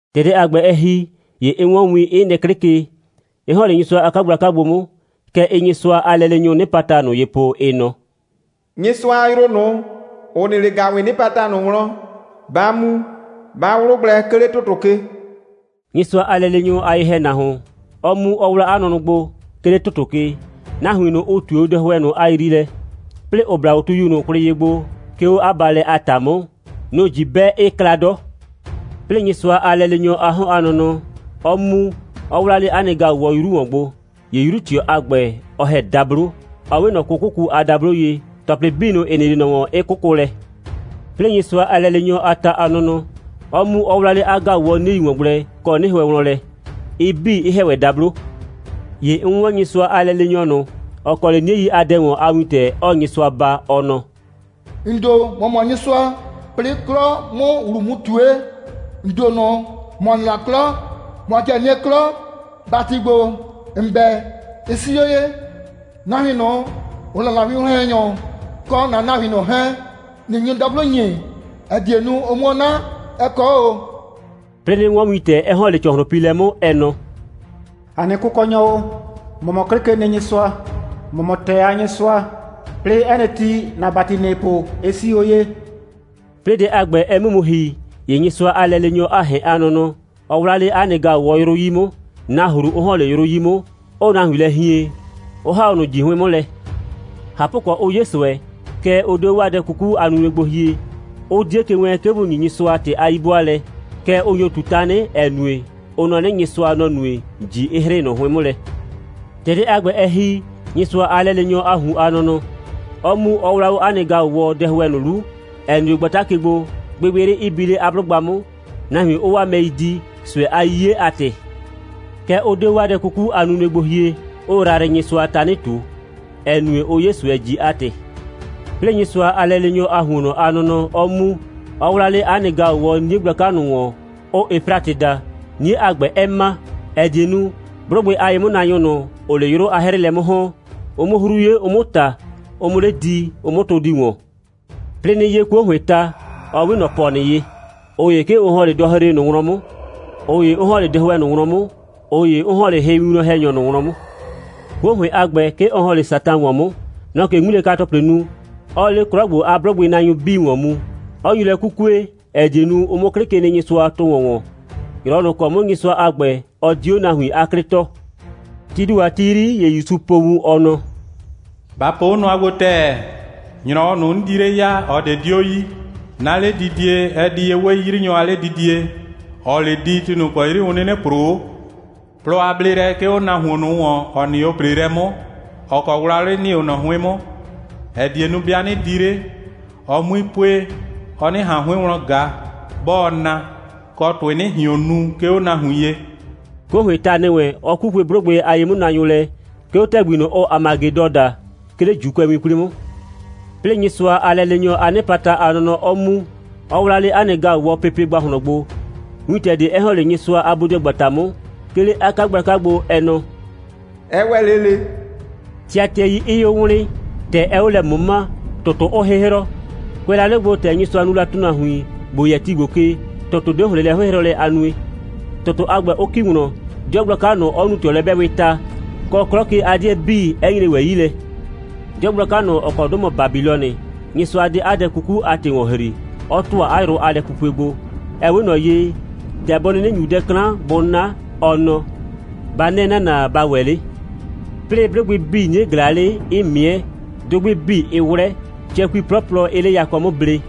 ‑Tɛ dɛ a ‑gbɛ, ɛ ‑hi, ‑ye 'n 'wɔn win, 'ɩ nɩ 'klɩ ke, 'ɩ ‑hɔn 'le Nyɩsʋa a 'kagblaka gbo 'mʋ. Kɛ ɩɩ Nyɩsʋa a lɛleenyʋʋ 'nɩpata ꞊nʋ ye po, ɩ nɔ: «Nyɩsʋa a yrʋ ꞊nʋ, ‑ʋ nɩ 'le ‑gaʋwɩɩ 'nɩpata ꞊nʋ wlɔn, ba mu, ba 'wlʋ gblɛ, 'ke 'le ‑tʋtʋ ke,» Nyɩsʋa a lɛleenyʋ a ye‑hɛnahuon, 'ɔ mu, 'ɔ 'wla 'a nʋnʋ gbo, 'ke 'le ‑tʋtʋ ke, nahuin ꞊nʋ, ʋ ꞊tue dɛhʋɛ ꞊nʋ a yriilɛ, 'plɩɩ ‑ʋ bla 'a tuyu ꞊nʋ kwlɩ ye gbo, 'ke 'o 'a baalɛ a ‑ta 'mʋ, nʋ‑ ꞊ji 'bɛ, 'ɩɩ kla 'dɔ. 'Plɩɩ Nyɩsʋa a lɛleenyɔ a 'hɔn a nɔnɔ 'ɔ mu, 'ɔ 'wla 'le 'a nɩ ‑gaʋwɔ 'yru ‑wɔn gbo. ‑Ye 'yru꞊tɩɔ a ‑gbɛ, ɔ ‑hɛ dablo, ‑ɔ 'we ꞊nɔ 'kʋkʋku a dablo ye, ‑tɔplɩ 'bii ꞊nʋ, ‑ɩ nɩ 'le ꞊nɔ ‑wɔn, 'ɩ 'kʋkʋ lɛ. 'Plɩɩ Nyɩsʋa a lɛleenyɔ a ta a nɔnɔ 'ɔ 'mu, 'ɔ 'wla 'le 'a ‑gaʋwɔ 'niei ‑wɔn gblɛ kɔ 'nɩhʋɛ wlɔn lɛ, ɩ 'bii, 'ɩ ‑hɛ ‑wɛ dablo. ‑Ye 'n 'wɔn Nyɩsʋa a lɛleenyɔ ꞊nʋ, ‑ɔ kɔ 'le 'niei a dɛ ‑wɔn a wintɛ, 'ɔɔ Nyɩsʋa baa, ɔ nɔ: «‑N ‑do, ‑mɔ mɔ Nyɩsʋa. 'Plɩɩ 'klɔ 'mʋ ‑wlu mu ꞊tue, ‑n ‑do ꞊nʋ, ‑mɔ nɩ la 'klɔ, ‑mɔ 'kɩɛ nɩɛ 'klɔ. ‑Bati ‑gbo, ‑n 'bɛ, ɩ 'sii 'o ye. Nahuin ꞊nʋ, ʋ 'la ‑na winwlɔn‑hɛnyʋ kɔ ‑na nahuin 'hɛɛn, ꞊nɩ nyu dablo ‑nyi, ‑ɛ die nu, ʋ 'muo 'na. Ɛ kɔ 'o ꞊o.» 'Plɩɩ 'nɩ 'wɔn wintɛ, 'ɛ ‑hɔn 'le ‑cɔhlʋnpiilɛ 'mʋ, ɛ nɔ: «‑A nɩ Kʋkɔnyɔ o, ‑mɔ mɔ 'Klɩkenɩnyɩsʋa. ‑Mɔ mɔ ‑tɛɛ a Nyɩsʋa. 'Plɩɩ 'ɛ nɩ ti, ‑na ‑bati, ‑nɩɩ po, ɩ 'sii 'o ye.» 'Plɩɩ dɛ a ‑gbɛ, ɛ 'mʋ mu ‑hi, ‑ye Nyɩsʋa a lɛleenyɔ a ‑hɛn a nɔnɔ, ɔ 'wla 'le 'a nɩ ‑gaʋwɔ 'yrʋ 'yi 'mʋ, nahru 'ʋ ‑hɔn 'le 'yrʋ 'yi 'mʋ, 'ʋʋ nahuin lɛ hien, 'ʋ ‑ha 'o ꞊nʋ ꞊ji 'hʋɩn 'mʋ lɛ. ꞊Hapʋkɔ, 'ʋ 'ye ꞊sʋɛ, kɛɛ, ʋ 'de 'o 'waa dɛ 'kuku a nunue gbo hie, 'ʋ 'die ke wɛɛn, 'ke bʋ ‑nyi Nyɩsʋa ‑tɩ a 'yi'bʋaalɛ, kɛɛ, ʋ nyo ꞊tu tanɩ, ‑ɛ nue, ʋ nɔ 'nɩ, Nyɩsʋa, nɔ‑ nue, ꞊ji 'ɩ 'hrɩ ꞊nʋ 'hʋɩn 'mʋ lɛ. ‑Tɛ dɛ a ‑gbɛ, ɛ ‑hi, Nyɩsʋa a lɛleenyɔ a ꞊hun a nɔnɔ 'ɔ mu, 'ɔ 'wla 'o 'a nɩ ‑gaʋwɔ dɛhʋɛ ꞊nʋ 'lu, ‑ɛ nɩ 'o gbata ke gbo, gbɩgbɩyrɩ 'ɩ bi 'le 'a 'blʋgba 'mʋ, nahuin 'ʋʋ 'waa mɛi di, ꞊sʋɛ a 'yiye a ‑tɩ. Kɛɛ, ʋ 'de 'o 'waa dɛ 'kuku a nunue gbo hie, 'ʋʋ Yrayrɩnyɩsʋa tanɩ ꞊tu, ‑ɛ nue, ʋʋ 'ye ꞊sʋɛ, ꞊ji a ‑tɩ. 'Plɩɩ Nyɩsʋa a lɛleenyɔ a ‑huonnɔ a nɔnɔ 'ɔ mu, 'ɔ 'wla 'le 'a nɩ ‑gaʋwɔ 'nie gblaka ꞊nʋ ‑wɔn, ʋʋ Efratɩ daa, 'nie a ‑gbɛ 'ɛ ma, ‑ɛ die nu, 'blʋgbɩ a ye'mʋnaanyʋ ꞊nʋ, ‑ʋʋ 'le 'yrʋ a 'hrɩɩlɛ 'mʋ ‑hɔn, ʋ 'mʋ 'hru 'ye, ʋ 'mʋ ꞊ta, ʋ 'mʋ 'le di, ʋ 'mʋ tʋ di ‑wɔn. 'Plɩɩ 'nɩ 'ye 'kuo ‑hʋɩɩn ta, 'ɔ 'we ꞊nɔ ‑pɔnɩ ye. ꞊Ʋ ‑ye, 'ke ʋ ‑hɔn 'le dɔhre ꞊nʋ wlɔn 'mʋ, ꞊ʋ ‑ye 'ʋ ‑hɔn 'le dɛhʋɛ ꞊nʋ wlɔn 'mʋ, ꞊ʋ ‑ye 'ʋ ‑hɔn 'le hɩwinwlɔn‑hɛnyɔ ꞊nʋ wlɔn 'mʋ. 'Kuo ‑hʋɩn a ‑gbɛ, 'ke ɔ ‑hɔn 'le Satan ‑wɔn 'mʋ. Nɔ‑ɔ ꞊ke 'ŋmilɛka‑tɔplɩ nu, 'ɔɔ 'le 'klɔ ‑gbo a 'blʋgbɩnaanyʋ 'bii ‑wɔn mu, 'ɔ nyu lɛ 'kukue, ‑ɛ die nu, ʋ 'mʋ 'Klɩkenɩnyɩsʋa tʋ ‑wɔn ‑wɔn, ‑nyrɔwɔ ꞊nʋ ‑kɔ 'mʋ Nyɩsʋa a ‑gbɛ, ɔ di 'o nahuin 'a 'klɩ tɔɔ. Tii ‑do a ti 'yri, ‑ye ‑Yusu po wun, ɔ nɔ: «Ba po 'o nʋa gbo ‑tɛɛ. ‑Nyrɔwɔ ꞊nʋ, 'n di 'le ya, ꞊ɔ ꞊de 'dio yi. 'Na 'ledidie, ɛ di ye 'we 'yrinyɔ a 'ledidie, ‑ɔɔ 'le di, ti ꞊nʋ ‑kɔ 'yri ʋ 'nɩnɩ ‑proo 'o. Plɔ a bleelɛ 'ke 'o nahuon ꞊nʋ ‑wɔn, ‑ɔ nɩ 'o ‑preelɛ 'mʋ, ‑ɔ kɔ wlawlɩ nɩ 'o ꞊nɔ 'hʋɩn 'mʋ, ‑ɛ die nu, 'bɩa 'nɩ di 'le, ɔ 'mui pue, ɔ 'nɩ ꞊han 'hʋɩn wlɔn ꞊ga, 'bɔɔ na, kɔ, ‑tʋɩ 'nɩ ꞊hion nu, 'ke 'o nahuin ye.» 'Kuo ‑hʋɩɩn ta ‑nɩ wɛn, ɔ 'kukue 'blʋgbɩ a ye'mʋnaanyʋ lɛ, 'ke 'o ‑tɛgbi ꞊nʋ, ʋʋ Hamagedɔ daa, 'ke 'le ‑Juukʋɛwin 'kwli 'mʋ. 'Plɩɩ Nyɩsʋa a lɛleenyɔ a 'nɩpata a nɔnɔ 'ɔ mu, 'ɔ 'wla 'le 'a nɩ ‑gaʋwɔ pepe ‑gbahlɔn gbo, wintɛ ꞊de 'ɛ ‑hɔn 'le Nyɩsʋa a bodɩɔgbata 'mʋ, 'ke 'le 'a 'kagblaka gbo, ɛ nɔ: «Ɛ ‑wɛ 'le ꞊le,» tɩatɩɛi 'ɩɩ 'o wlɩɩn, ‑tɛ 'ɛɛ 'o lɛ ꞊mʋmaa, ‑tʋtʋ 'ʋʋ 'hɩhrɔ. Kʋɛ la 'le gbo, ‑tɛ Nyɩsʋa nu la ‑tʋnahuin, ‑bo yɛ ti ‑gbo ke, ‑tʋtʋ 'de ‑hlɩn lɛ 'hɩhrɔlɛ a nue, ‑tʋtʋ a ‑gbɛ 'ʋ ‑ki wlɔn, 'dɩɔ gblaka ꞊nʋ 'ɔ nu ꞊tɩɔlɛ'bɛɛwɩɩ ta, kɔ, 'klɔ ke a 'dɩɛ 'bii, 'ɛ nyre ‑wɛ 'yi lɛ. 'Dɩɔ gblaka ꞊nʋ, ‑ɔ kɔ 'dʋ mɔ Babilɔnɩ, Nyɩsʋa 'de 'a dɛ 'kuku 'a ‑tɩ ‑wɔn ‑hri, 'ɔ ‑tʋa 'a yrʋ a lɛpupue gbo. Ɛ 'we ꞊nɔ ye, ‑tɛ bɔ 'nɩnɩ ‑nyu dɛ 'klan, bʋ 'na, ɔ nɔ: «Ba 'nɛ ‑nana, ba ‑wɛ 'le!» 'Plɩɩ, 'blʋgbɩ 'bii, 'nie ꞊glaa 'le, 'ɩɩ ꞊mɩɛ, dʋgbɩ 'bii 'ɩɩ 'wlɛ, cɛkui 'plɔplɔ 'ɩɩ 'le yakɔ 'mʋ ble.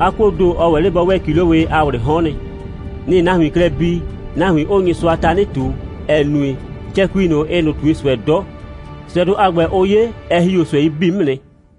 'A 'kuoo ‑do, ɔ ‑wɛ 'le bɔ 'wɛɛ ‑kilowɩɩ a ꞊wlɩɩ 'hɔn nɩ. Nɩ‑ɩ nahuin klɛ bi, nahuin 'ʋʋ Nyɩsʋa tanɩ ꞊tu, ‑ɛ nue, cɛkui ꞊nʋ, ɩɩ ꞊nʋ ꞊tue ꞊sʋɛ 'dɔ. ꞊Sʋɛdʋ a ‑gbɛ, ʋʋ 'ye, ɛ ‑hi 'o ꞊sʋɛi 'bii 'mʋ nɩ.